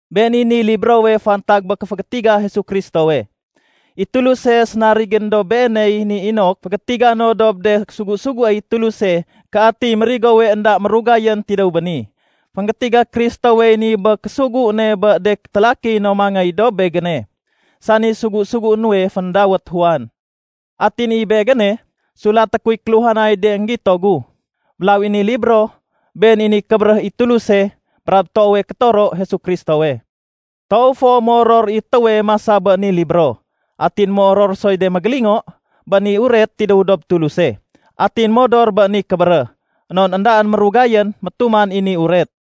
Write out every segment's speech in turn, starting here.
Been i niy librowe fantag bé kéfégétiga Jesu Kristowe. I Tuluse sénarigén dob Beeney ni inok fégétiga no dob de sugu-suguéy Tuluse ké atiy mérigowe énda mérugayén tidéw béni. Fénggétiga Kristowey ni bé késugu ne bé de télaki no mangéy dob begéne, sani sugu-sugué nuwe féndawét Juan. Atin i begéne, sulaté kuy kéluhanay de énggito gu. Mélaw i ni libro, been i niy kébéréh i Tuluse brab toowe kétoro Jesu Kristowe. Toow fo moror i étéwe masa bé ni libro, atin moror soy de mégélingo bé ni uret tidéw dob Tuluse atin modor bé ni kébéréh. Non éndaén mérugayén métuman i ni uret.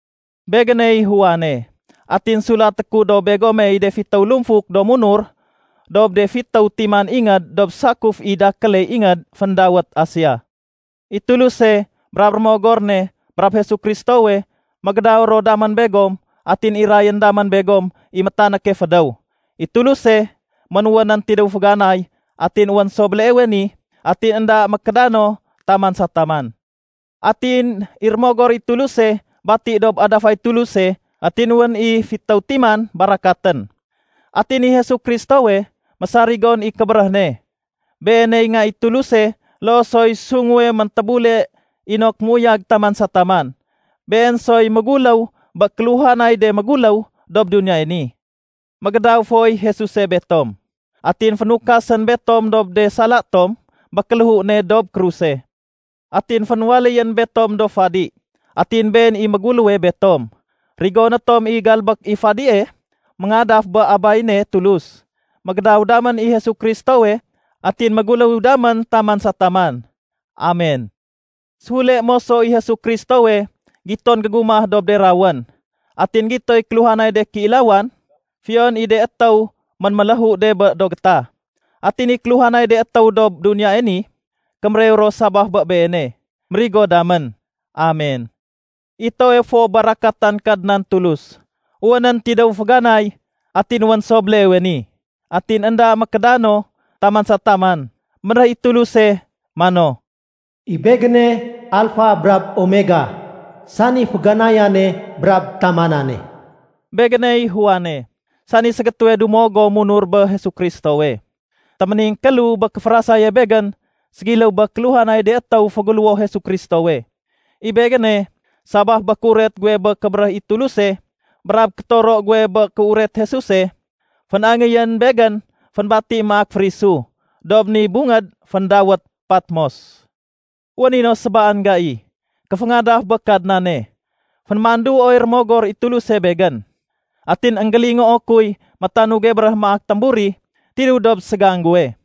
Begéney Juane, atin sulaté ku dob begomey de fitéw lumfuk do munur dob de fitéw timan ingéd dob sakuf i dakéle ingéd féndawét Asia. I Tuluse brab Rémogor ne brab Jesu Kristowe, mégédaw ro damén begom atin irayén damén begom i métanéke fédéw. I Tuluse, ménwénén tidéw féganay, atin wén so béleewe ni, atin énda mékédano taman sa taman. Atin i Rémogor i Tuluse bati dob adafay Tuluse atin wén i fitéw fiman barakatén. Atin i Jesu Kristowe, mésarigon i kébéréh ne. Beeney Nga i Tuluse loo soy sunguwe méntébule inok méuyag taman sa taman. Been soy méguléw bé kéluhanay de méguléw dob duniyae ni. Mégédaw foy Jesuse betom. Atin fénukasén betom dob de sala tom bé kéléhu ne dob kruse. Atin fénwaléyén betom do fadi, atin Been i méguléwe betom. Rigoné tom i galbék i fadie méngadaf bé Abay ne Tulus. Mégédaw damén i Jesu Kristowe atin méguléw damén taman sa taman. Amen! Séfule moso i Jesu Kristowe giton gégumah dob de rawén. Atin gitoy kéluhanay de kéilawan, fiyon i de étéw ménméléhu de bé do gétah. Atin i kéluhanay de étéw dob duniyae ni, kémérew ro sabaf bé Beene. Mérigo damén. Amen. I toowe fo barakatan Kadnan Tulus, wénén tidéw féganay, atin wén so béleewe ni, atin énda mékédano taman sa taman. Bénréh i Tuluse mano, “I Begéne Alfa brab Omega, sani féganayane brab tamanane.” Begéney Juane, sani ségétéwe dumo gom munur bé Jesu Kristowe. Téméningkélu bé kéférasaye begén ségiléw bé kéluhanay de étéw féguléwo Jesu Kristowe. I Begéne, sabaf bé kéuret guwe bé kébéréh i Tuluse brab kétoro guwe bé kéuret Jesuse, fén-angéyén begén fénbati maak férisu dob ni bungéd féndawét Patmos. Wén i no sébaan gai kéféngadaf bé Kadnane, fénémanduoy Rémogor i Tuluse begén. Atin énggélingoo kuy métanuge béréh maak témburi tidéw dob ségang guwe.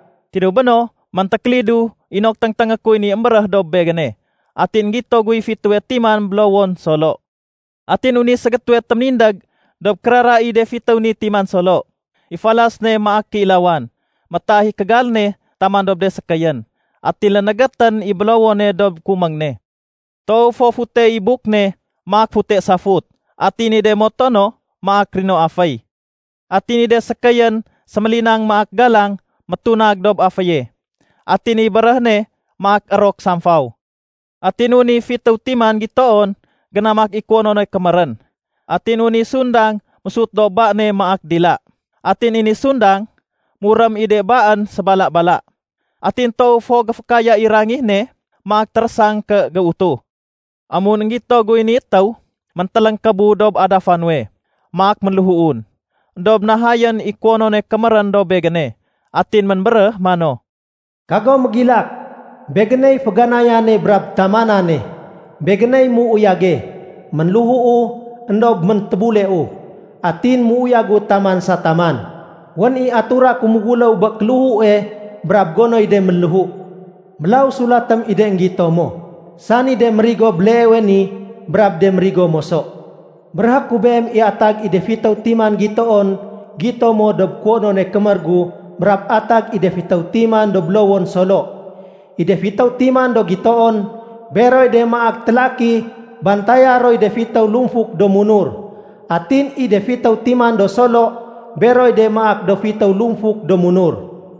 Tidéw béno méntékélidu inok téngténgé kuy ni émbéréh dob begéne. Atin énggito guy fitéwe timan bélowon solo. Atin wén i ségétéwe téménindég dob kérara i de fitéw ni timan solo. I falas ne maak kéilawane. Métaah i kégal ne taman dob de sékéyén. Atin lénégétén i bélowone dob kuméng ne. Toow fo fute i buk ne maak fute safut, atin i de moto no maak rino aféy. Atin i de sékéyén sémélinang maak galang métunag dob aféye. Atin i béréh ne maak érok samfaw. Atin wén i fitéw timan gitoon génamak i kuwonone kémérén. Atin wén i sundang mésut dob ba ne maak dila. Atin i ni sundang, murém i de baén sébala-bala. Atin toow fo géfékaya i rangih ne maak térésang ké géutuh. Amun énggito guy ni étéw, méntéléngkébu dob adafa nuwe maak ménléhuun. Endob nahayén i kuwonone kémérén dob begéne atin ménbéréh mano, “Kago mégilak. Begéney féganayane brab tamanane. Begéney méuyage. Ménléhuu, éndob méntébuleu, atin méuyagu taman sa taman. Wén i atura ku méguléw bé kéléhue brab gonoy de ménléhu. Mélaw sulatém i de énggito mo, sani de mérigo béleewe ni brab de mérigo moso. Béréhé ku beem i atag i de fitéw timan gitoon gito mo dob kuwonone kémér gu brab atag i de fitéw timan do bélowon solo. I de fitéw timan do gitoon, beroy de maak télaki bantaya roy de fitéw lumfuk do munur. Atin i de fitéw timan do solo, beroy de maak do fitéw lumfuk do munur.”